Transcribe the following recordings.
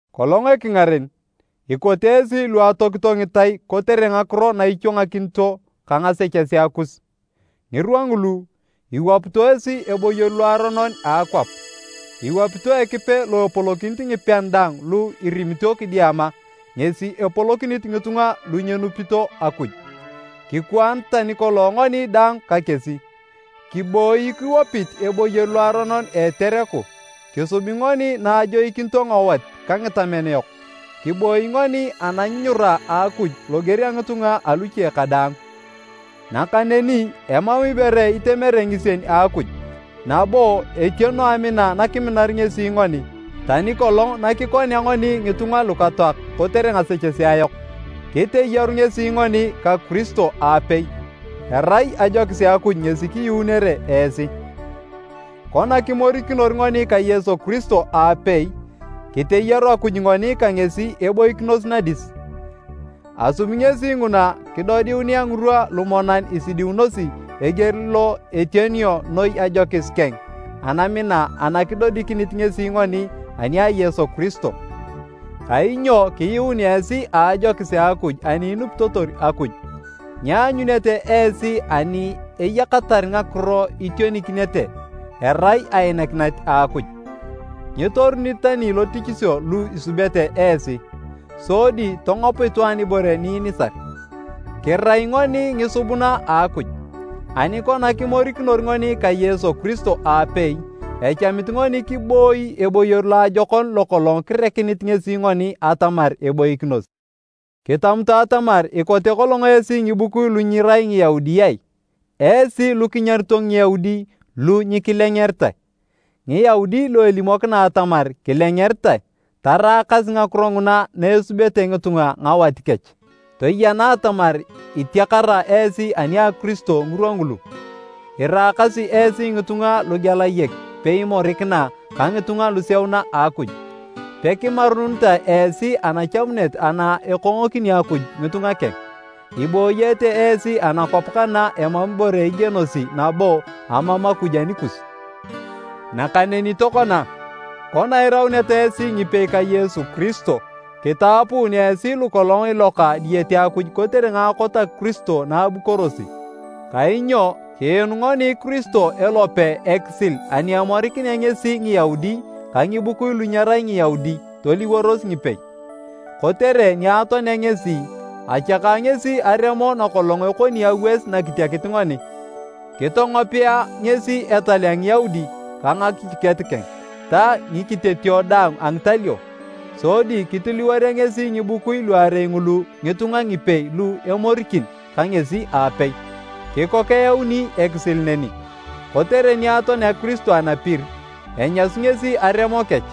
Kolong ekingaren, ikote esi lu atoakito ngitai kotere ngakiro na ichwangakinito ka ngasechesea kus. Ngirwa ngulu, iwapito esi eboyor loaronon a akwap, iwapito Ekipe lo epolokinit ngipean daang lu irimito kidiama, ngesi epolokinit ngitunga lu nyenupito Akuj. Kikwaan tani kolong ngoni daang ka kesi, kiboi kiwapit eboyor loaronon a etereku, kisubi ngoni na ajoikinito ngawat ka ngitamen yok. Kiboi ngoni ananyunyura a Akuj loger a ngitunga aluche kadaang. Nakaneni emam ibore itemere ngisien a Akuj nabo etiono amina nakiminar ngesi ngoni, tani kolong nakikonea ngoni ngitunga lukatoak kotere ngasechesea yok, kiteyaru ngesi ngoni ka Kiristo aapei. Erai ajokis a Akuj ngesi kiyuunere esi. Kona kimorikinor ngoni ka Yesu Kiristo aapei, kiteyaru Akuj ngoni ka ngesi eboikinos nadis. Asubi ngesi nguna kidodiunea ngirwa lumonan isidiunosi eger lo etionio noi ajokis keng anamina ana kidodikinit ngesi ngoni ani a Yesu Kiristo. Kainyo kiyuun esi a ajokis a Akuj ani inupitotor Akuj. Nyianyunete esi ani eyakatar ngakiro itionikinete, erai ainakinet a Akuj. Nyitorunit tani lotichisio lu isubete esi, sodi tongop itwaan ibore ni inisar. Kirai ngoni ngisubuna a Akuj, ani kona kimorikinor ngoni ka Yesu Kiristo aapei, echamit ngoni kiboi eboyor loajokon lokolong kirekinit ngesi ngoni atamar eboikinos. Kitamutu atamar ikote kolong esi ngibukui lu nyirai Ngiyaudi ai, esi lu kinyarito Ngiyaudi “lu nyikilengeritae” Ngiyaudi lu elimokina atamar, “kilengeritae” (taraakas ngakiro nguna na esubeta ngitunga ngawat kech). Toyena atamar itiakara esi ani a Kiristo ngirwa ngulu. Iraakasi esi ngitunga lugelayek peimorikina ka ngitunga luseuna a Akuj. Pekimarunitae esi anachamuneta ana ekongokini Akuj ngitunga keng. Ibooyete esi anakwap kana emam ibore igienosi nabo amam Akuj anikus. Nakaneni tokona, kona irauneta esi ngipei ka Yesu Kiristo, kitapuun esi lukolong iloka diyete Akuj kotere ngaakot a Kiristo na abukorosi. Kainyo kiinu ngoni Kiristo elope ekisil ani emorikinea ngesi Ngiyaudi ka ngibukui lu nyerai Ngiyaudi toliworos ngipei. Kotere ni atoanea ngesi, achaka ngesi aremo nakolong ekoni awas nakitiakit ngoni. Kitongopea ngesi etal a Ngiyaudi ka ngakichiket keng ta ngikitetio daang a ngitalio, sodi kitiliworea ngesi ngibukui luarei ngulu ngitunga ngipei lu emorikin ka ngesi aapei, kikok eyauni ekisil neni. Kotere ni atoanea Kiristo anapir, enyasu ngesi aremo kech,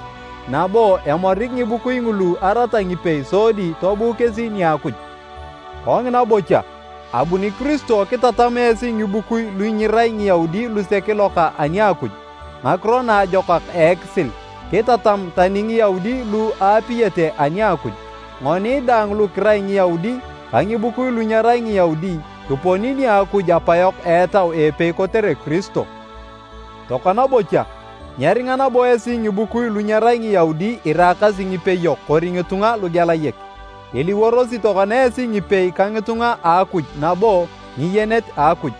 nabo emorik ngibukui ngulu arata ngipei sodi tobuu kesi nia Akuj. Kongina bocha, abuni Kiristo kitatam esi ngibukui lu nyirai Ngiyaudi lusek iloka ani a Akuj, Ngakiro Naajokak a ekisil, kitatam tani Ngiyaudi lu aapiyete ani a Akuj. Ngoni daang lu kirai Ngiyaudi ka ngibukui lu nyerai Ngiyaudi kiponi nia Akuj Apayok a Etau a epei kotere Kiristo. Tokona bocha, nyeringa nabo esi ngibukui lu nyerai Ngiyaudi iraakasi ngipeyok kori ngitunga lugelayek, iliworosi tokona esi ngipei ka ngitunga a Akuj nabo ngiyenet a Akuj.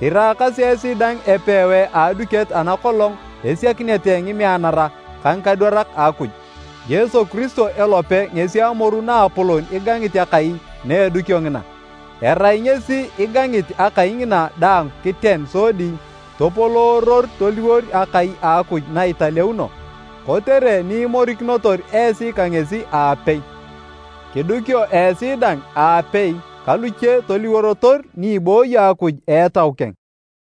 Iraakasi esi dang epewae a aduket ana kolong esiakinete ngimeanara ka ngikadwarak a Akuj, Yesu Kiristo elope ngesi amoru naapolon igangit akai na edukio ngina. Erai Ngesi igangit akai ngina daang kiten sodi topolooror toliwor akai a Akuj na italeuno. Kotere ni imorikinotor esi ka ngesi aapei. Kidukio esi dang aapei ka luche toliworotor ni ibooyo Akuj a Etau keng.